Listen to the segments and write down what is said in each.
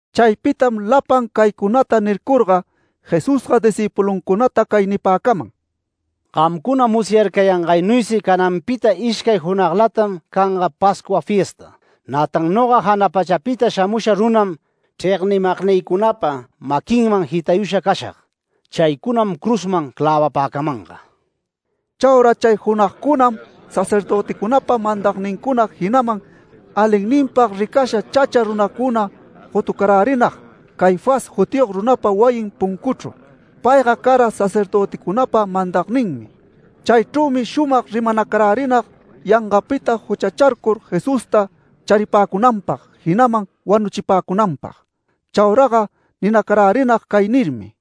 Chaypitam lapan caycunata nircurga, Jesusga discïpuluncunata cay nipäcaman: “Gamcuna musyarcayangaynuysi cananpita ishcay junaglatam canga Pascua fiesta. Nätan noga jana pachapita shamusha runam chregnimagnïcunapa maquinman jitayusha cashag. Chaycunam cruzman clävapäcamanga”. Chauraga chay junagcunam sacerdöticunapa mandagnincuna jinaman alinninpag ricasha chacha runacuna gotucarärinag Caifás jutiyog runapa wayin puncuchru. Payga cara sacerdöticunapa mandagninmi. Chaychrümi shumag rimanacarärinag yangapita juchacharcur Jesusta charipäcunanpag jinaman wanuchipäcunanpag. Chauraga ninacarärinag cay nirmi: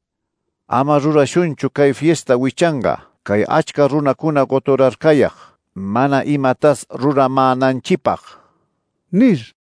“Ama rurashunchu cay fiesta wichanga cay achca runacuna goturarcayag mana imatas ruramänanchipag” nir.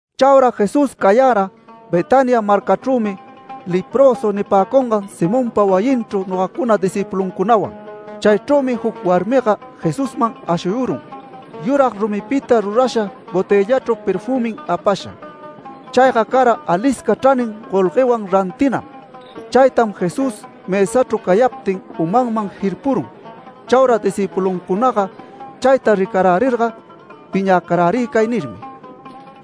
Chaura Jesús cayara Betania marcachrümi leprösu nipäcungan Simonpa wayinchru nogacuna discïpuluncunawan. Chaychrümi juc warmiga Jesusman ashuyurun, yurag rumipita rurasha botëllachru perfümim apasha. Chayga cara alisca chranin golguewan rantinam. Chaytam Jesús mësachru cayaptin umanman jirpurun. Chaura discïpuluncunaga chayta ricarärirga piñäcarärï cay nirmi: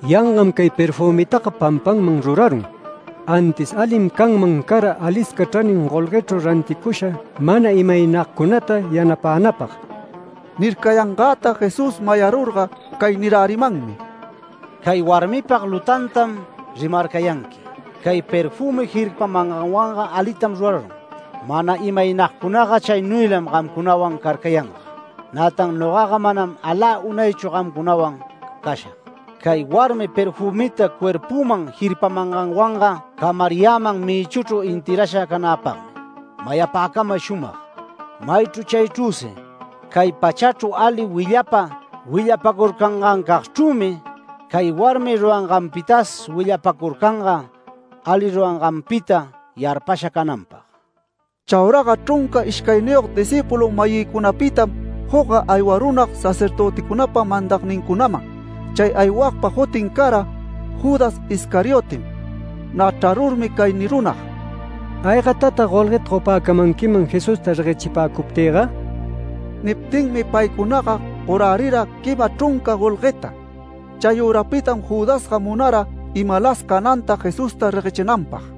“¡Yangam cay perfümitaga pampanman rurarun! Antis alim canman cara alisca chranin golguechru ranticurusha mana imaynagcunata yanapänapag”. Nircayangäta Jesús mayarurga cay nirärimanmi: “Cay warmipag lutantam rimarcayanqui. Cay perfümi jirpamanganwanga alitam rurarun. Mana imaynagcunaga chaynuylam gamcunawan carcayanga. Nätan nogaga manam alä unaychu gamcunawan cashag. Cay warmi perfümita cuerpüman jirpamanganwanga camariyäman mïchuchru enterrasha canäpagmi. Mayapäcamay shumag: Maychru chaychrüsi cay pachachru ali willapa willapacurcangancagchrümi cay warmi ruranganpitas willapacurcanga ali ruranganpita yarpasha cananpag”. Chauraga chrunca ishcayniyog discïpulu-mayïcunapitam jucga aywarunag sacerdöticunapa mandagnincunaman. Chay aywagpa jutin cara Judas Iscariotem. Nä chrarurmi cay nirunag: “¿Aygatatag golgueta gopäcamanquiman Jesusta reguechipäcuptïga?” Niptinmi paycunaga gorärira quima chrunca golgueta. Chayürapitam Judasga munara imalas cananta Jesusta reguechinanpag.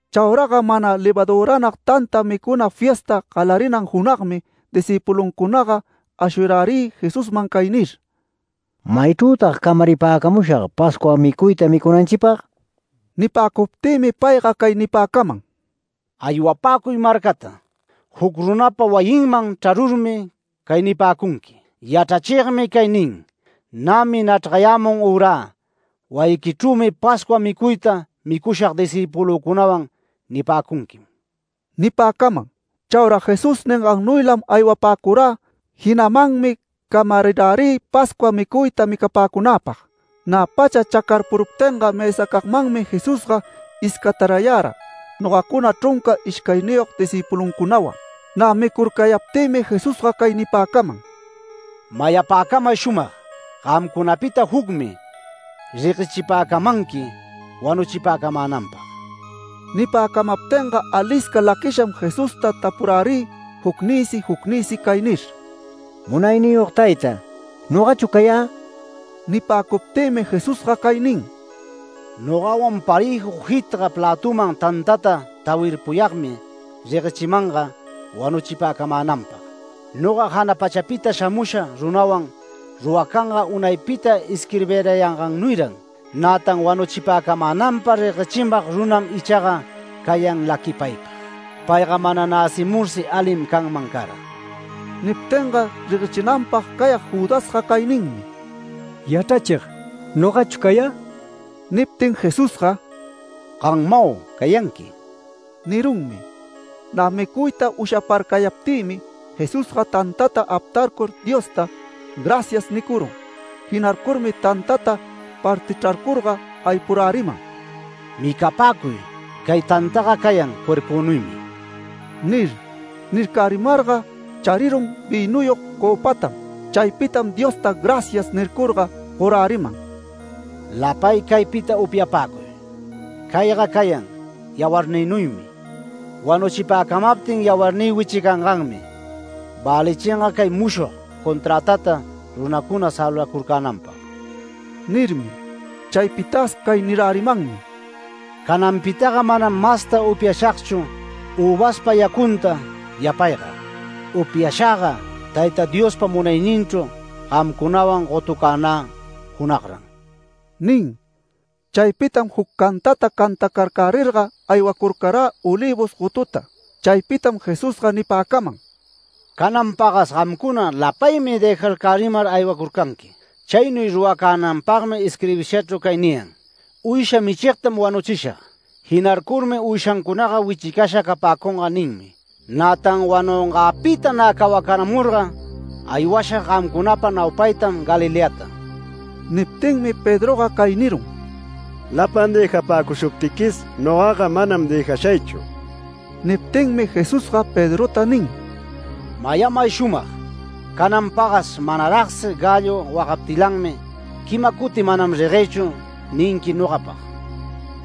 Chauraga mana levaduränag tanta micuna fiesta galarinan junagmi discïpuluncunaga ashuyarärï Jesusman cay nir: “¿Maychrütag camaripäcamushag Pascua micuyta micunanchipag?” Nipäcuptïmi payga cay nipäcaman: “Aywapäcuy marcata. Juc runapa wayinman chrarurmi cay nipäcunqui: ‘Yachrachigmi cay nin: Nämi nachrgayämun ürä wayiquichrümi Pascua micuyta micushag discïpulücunawan’ nipäcunquim” nipäcaman. Chaura Jesús ningannuylam aywapäcurä, jinamanmi camarirärï Pascua micuyta micapäcunäpag. Nä pacha chacarpuruptinga mësacagmanmi Jesusga iscatarayara nogacuna chrunca ishcayniyog discïpuluncunawan. Nä micurcayaptïmi Jesusga cay nipäcaman: “Mayapäcamay shumag: Gamcunapita jucmi reguechipäcamanqui wanuchipäcamänanpag”. Nipäcamaptinga alisca laquisham Jesusta tapurärï jucnïsi jucnïsi cay nir: “Munayniyog tayta, ¿nogachu cayä?” Nipäcuptïmi Jesusga cay nin: “Nogawan parëju jitga plätuman tantata tawirpuyagmi reguechimanga wanuchipäcamänanpag. Noga jana pachapita shamusha runawan ruracanga unaypita isquirbirayangannuyran. Nätan wanuchipäcamänanpag reguechimag runam ichaga cayan laquipaypag. Payga mana näcimursi alim canman cara”. Niptinga reguechinanpag cayag Judasga cay ninmi: “Yachrachig, ¿nogachu cayä?” Niptin Jesusga “Gammau cayanqui” nirunmi. Nä micuyta ushaparcayaptïmi Jesusga tantata aptarcur Diosta “Gracias” nicurun. Jinarcurmi tantata partichrarcurga aypuräriman “Micapäcuy, cay tantaga cayan cuerpünuymi” nir. Nircärimarga charirun vïnuyog cöpatam. Chaypitam Diosta “Gracias” nircurga, goräriman “Lapay caypita upyapäcuy. Cayga cayan yawarnïnuymi. Wanuchipäcamaptin yawarnï wichicanganmi, välichinga cay mushog conträtata runacuna salvacurcänanpag” nirmi. Chaypitas cay nirärimanmi: “Cananpitaga manam masta upyashagchu üvaspa yacunta yapayga, upyashagga Tayta Diospa munayninchru gamcunawan gotucänä junagran” nin. Chaypitam juc cantata cantacarcärirga aywacurcarä Olivos gotuta. Chaypitam Jesusga nipäcaman: “Canan pagas gamcuna lapaymi dëjarcärimar aywacurcanqui. Chaynuy ruracänanpagmi isquirbishachrüsi cay niyan: ‘Uysha michigtam wanuchishag. Jinarcurmi uyshancunaga wichicasha capäcunga’ ninmi. Nätan wanungäpita nä cawacaramurga aywashag gamcunapa naupaytam Galileata”. Niptinmi Pedroga cay nirun: “Lapan dëjapäcushuptiquis nogaga manam dëjashaychu”. Niptinmi Jesusga Pedrota nin: “Mayamay shumag: Canan pagas manaragsi gallo wagaptilanmi quima cuti ‘Manam reguëchu’ ninqui nogapag”.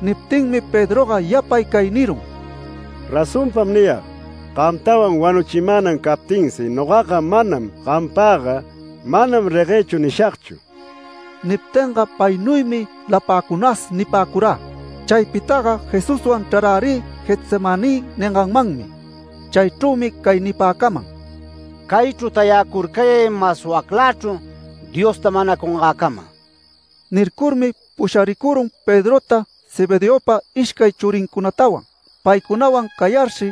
Niptinmi Pedroga yapay cay nirun: “¡Razonpam niyag: Gamtawan wanuchimänan captinsi nogaga manam gampagga ‘Manam reguëchu’ nishagchu!” Niptinga paynuymi lapäcunas nipäcurä. Chaypitaga Jesuswan chrarärï Getsemaní ninganmanmi. Chaychrümi cay nipäcaman: “Caychru tayacurcayay mas waclächru Diosta manacamungäcama”. Nircurmi pusharicurun Pedrota Zebedeopa ishcay churincunatawan. Paycunawan cayarshi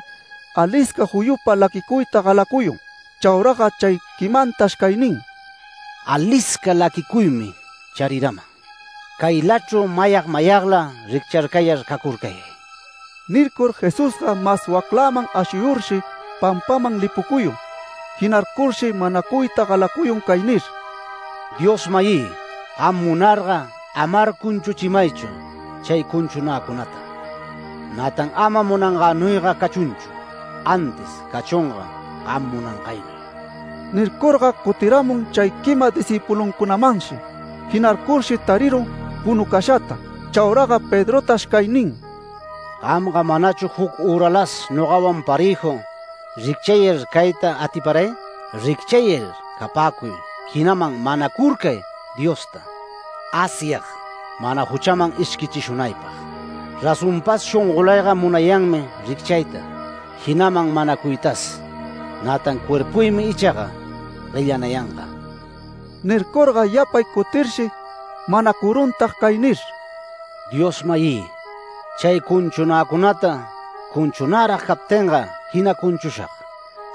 alisca juyupa laquicuyta galacuyun. Chauraga chay quimantash cay nin: “Alisca laquicuymi chariraman. Caylachru mayag mayagla riccharcayar cacurcayay”. Nircur Jesusga mas waclaman ashuyurshi pampaman lipucuyun. Jinarcurshi manacuyta galacuyun cay nir: “Dios-mayï, gam munarga amar cunchuchimaychu chay cunchunäcunata. Nätan ama munangänuyga cachunchu, antis cachunga gam munangaynuy”. Nircurga cutiramun chay quima discïpuluncunamanshi. Jinarcurshi tarirun punucashata. Chauraga Pedrotash cay nin: “Gamga manachu juc üralas nogawan parëju ricchayar cayta atiparay. Ricchayar capäcuy, jinaman manacurcay Diosta, Asyag mana juchaman ishquichishunaypag. Razonpas shongolayga munayanmi ricchayta, jinaman manacuytas, nätan cuerpuymi ichaga guellanayanga”. Nircurga yapay cutirshi manacuruntag cay nir: “Dios-mayï. Chay cunchunäcunata cunchunärag captinga jina cunchushag.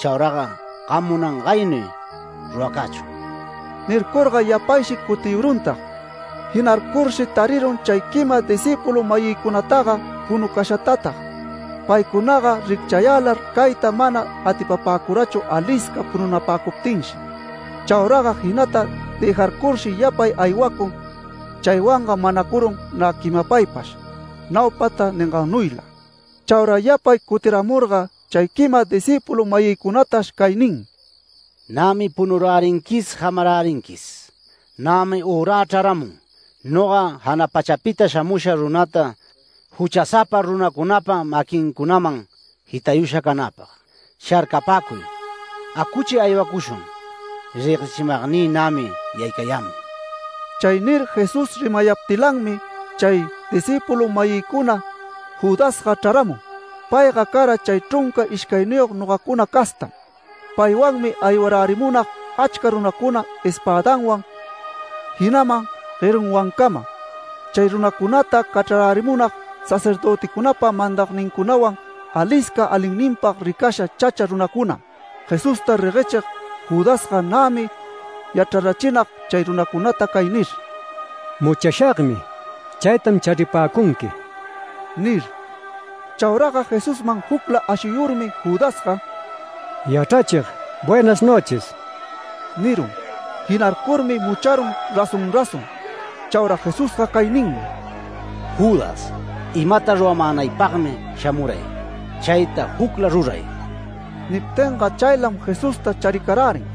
Chauraga gam munangaynuy ruracächun”. Nircurga yapayshi cutiyuruntag, jinarcurshi tarirun chay quima discïpulu-mayïcunataga punucashatatag. Paycunaga ricchayälar cayta mana atipapäcurachu alisca pununapäcuptinshi. Chauraga jinata dëjarcurshi yapay aywacun, chaywanga manacurun nä quimapaypash naupata ningannuyla. Chaura yapay cutiramurga chay quima discïpulu-mayïcunatash cay nin: “Nämi punurärinquis jamarärinquis. Nämi ürä chraramun noga jana pachapita shamusha runata juchasapa runacunapa maquincunaman jitayusha canäpag. Sharcapäcuy, acuchi aywacushun. Reguechimagnï nämi yaycayämun”. Chay nir Jesús rimayaptilanmi chay discïpulu-mayïcuna Judasga chraramun. Payga cara chay chrunca ishcayniyog nogacuna castam. Paywanmi aywarärimunag achca runacuna espädanwan jinaman guerunwancama. Chay runacunata cachrarärimunag sacerdöticunapa mandagnincunawan, alisca alinninpag ricasha chacha runacunam. Jesusta reguechig Judasga nämi yachrarachinag chay runacunata cay nir: “Muchashagmi. Chaytam charipäcunqui” nir. Chauraga Jesusman jucla ashuyurmi, Judasga “Yachrachig, buenas noches” nirun. Jinarcurmi mucharun razón razón. Chaura Jesusga cay ninmi: “Judas, imata ruramänaypagmi shamuray, chayta jucla ruray”. Niptinga chaylam Jesusta charicarärin.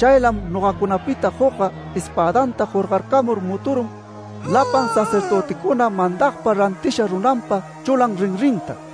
Chaylam nogacunapita jucga espädanta jorgarcamur muturun lapan sacerdöticuna mandagpa rantisha runanpa chulan rinrinta.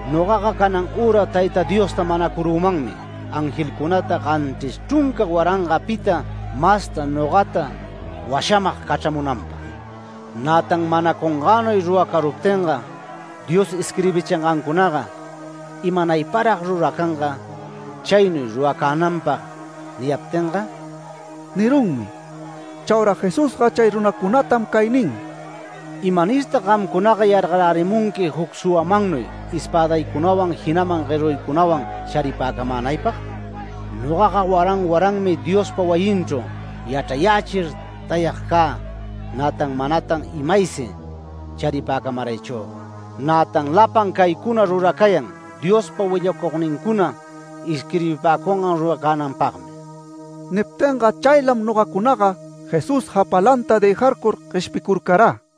Nogaga canan üra Tayta Diosta manacurümanmi angelcunata ganchris chrunca warangapita masta nogata washamag cachramunanpag. Nätan manacungänuy ruracaruptinga, Dios isquirbichingancunaga ¿imaynayparag ruracanga, chaynuy ruracänanpag niyaptinga?” nirunmi. Chaura Jesusga chay runacunatam cay nin: “¿Imanirtag gamcunaga yargarärimunqui juc suwamannuy espädaycunawan jinaman gueruycunawan charipäcamänaypag? Nogaga waran waranmi Diospa wayinchru yachrayächir tayag cä. Nätan manatan imaysi charipäcamaraychüga. Nätan lapan caycuna ruracayan Diospa willacugnincuna isquirbipäcungan ruracänanpagmi”. Niptinga chaylam nogacunaga Jesús japalanta dëjarcur gueshpicurcarä.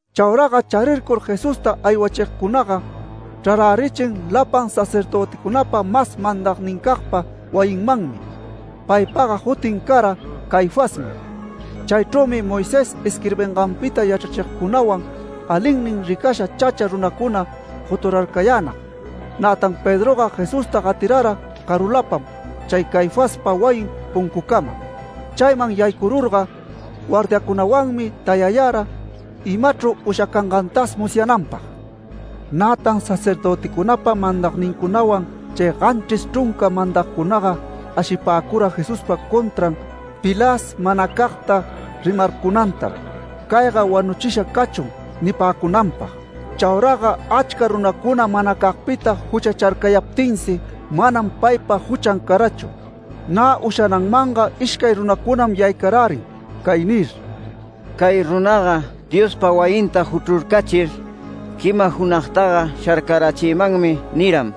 Chauraga charircur Jesusta aywachigcunaga chrarärichin lapan sacerdöticunapa mas mandagnincagpa wayinmanmi. Paypaga jutin cara Caifasmi. Chaychrümi Moisés isquirbinganpita yachrachigcunawan alinnin ricasha chacha runacuna goturarcayänag. Nätan Pedroga Jesusta gatirara carulapam chay Caifaspa wayin puncucama. Chayman yaycururga, guardiacunawanmi tayayara imachru ushacangantas musyananpag. Nätan sacerdöticunapa mandagnincunawan chay ganchris chrunca mandagcunaga ashipäcura Jesuspa contran pilas manacagta rimarcunantam “Cayga wanuchisha cachun” nipäcunanpag. Chauraga achca runacuna manacagpita juchacharcayaptinsi, manam paypa juchan carachu. Nä ushananmanga ishcay runacunam yaycarärin cay nir: “Cay runaga ‘Diospa wayinta juchrurcachir, quima junagtaga sharcarachimanmi’ niram”.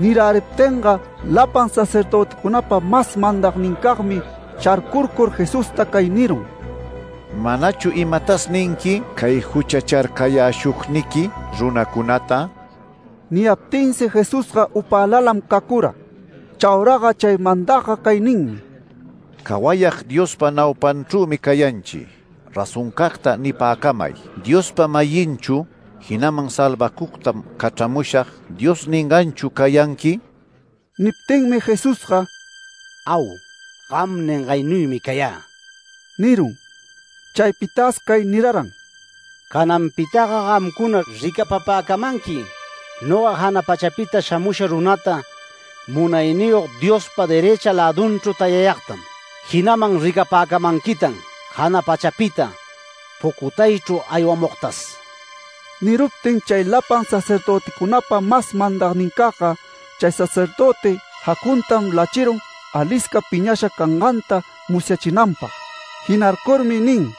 Niräriptinga lapan sacerdöticunapa mas mandagnincagmi sharcurcur Jesusta cay nirun: “¿Manachu imatas ninqui cay juchacharcayäshugniqui runacunata?” Niyaptinsi Jesusga upälalam cacura. Chauraga chay mandagga cay ninmi: “Cawayag Diospa naupanchrümi cayanchi. Razoncagta nipäcamay, ¿Diospa-mayinchu jinaman ‘Salvacugtam cachramushag’ Dios ninganchu cayanqui?” Niptinmi Jesusga “Au. Gam ningaynuymi cayä” nirun. Chaypitas cay niraran: “Cananpitaga gamcuna ricapapäcamanqui noga jana pachapita shamusha runata Munayniyog Diospa derëcha lädunchru tayayagtam. Jinaman ricapäcamanquitan jana pachapita pucutaychru aywamugtas”. Niruptin chay lapan sacerdöticunapa mas mandagnincagga chay sacerdöti jacuntam lachirun alisca piñasha canganta musyachinanpag. Jinarcurmi nin: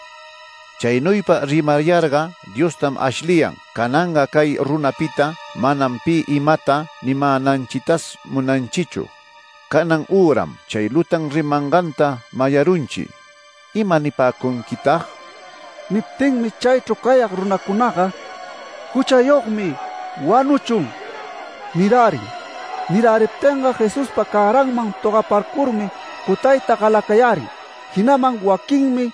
“¡Chaynuypa rimayarga Diostam ashliyan! Cananga cay runapita manam pi imata nimänanchitas munanchichu. ¡Canan üram chay lutan rimanganta mayarunchi! ¿Ima nipäcunquitag?” Niptinmi chaychru cayag runacunaga “¡Juchayogmi! ¡Wanuchun!” nirärin. Niräriptinga Jesuspa cäranman togaparcurmi cutayta galacayärin. Jinaman waquinmi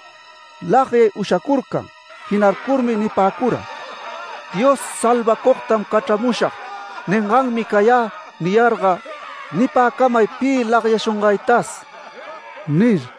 lagyay ushacurcan. Jinarcurmi nipäcura: “Dios ‘Salvacugtam cachramushag’ ninganmi cayä niyarga, nipäcamay pi lagyashungaytas” nir.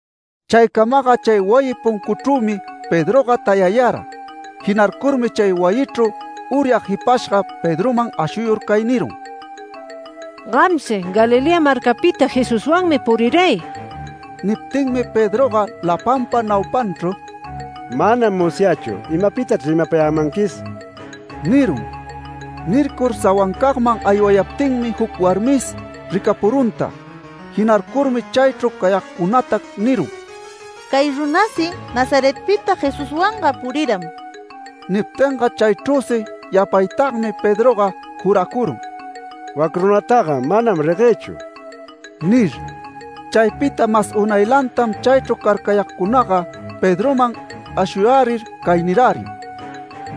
Chaycamaga chay wayi puncuchrümi Pedroga tayayara. Jinarcurmi chay wayichru uryag jipashga Pedroman ashuyur cay nirun: “Gamsi Galilea marcapita Jesuswanmi puriray”. Niptinmi Pedroga lapanpa naupanchru “Manam musyächu imapitachr rimapayämanquis” nirun. Nircur sawancagman aywayaptinmi juc warmis ricapuruntag. Jinarcurmi chaychru cayagcunata nirun: “Cay runasi Nazaretpita Jesuswanga puriram”. Niptinga chaychrüsi yapaytagmi Pedroga juracurun “Wac runataga manam reguëchu” nir. Chaypita mas unaylantam chaychru carcayagcunaga Pedroman ashuyärir cay nirärin: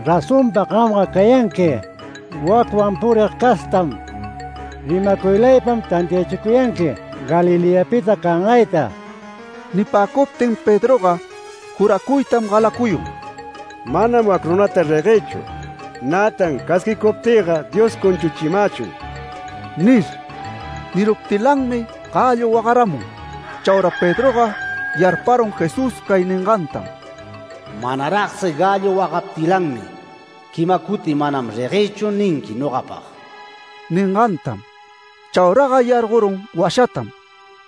“Razonpa gamga cayanqui wacwan purig castam. Rimacuylaypam tantiachicuyanqui Galileapita cangayta”. Nipäcuptin Pedroga juracuytam galacuyun “Manam wac runata reguëchu. Nätan casquicuptïga Dios cunchuchimächun” nir. Niruptilanmi gallo wagaramun. Chaura Pedroga yarparun Jesús cay ningantam: “Manaragsi gallo wagaptilanmi quima cuti ‘Manam reguëchu’ ninqui nogapag” ningantam. Chauraga yargorun washatam.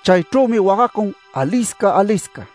Chaychrümi wagacun alisca alisca.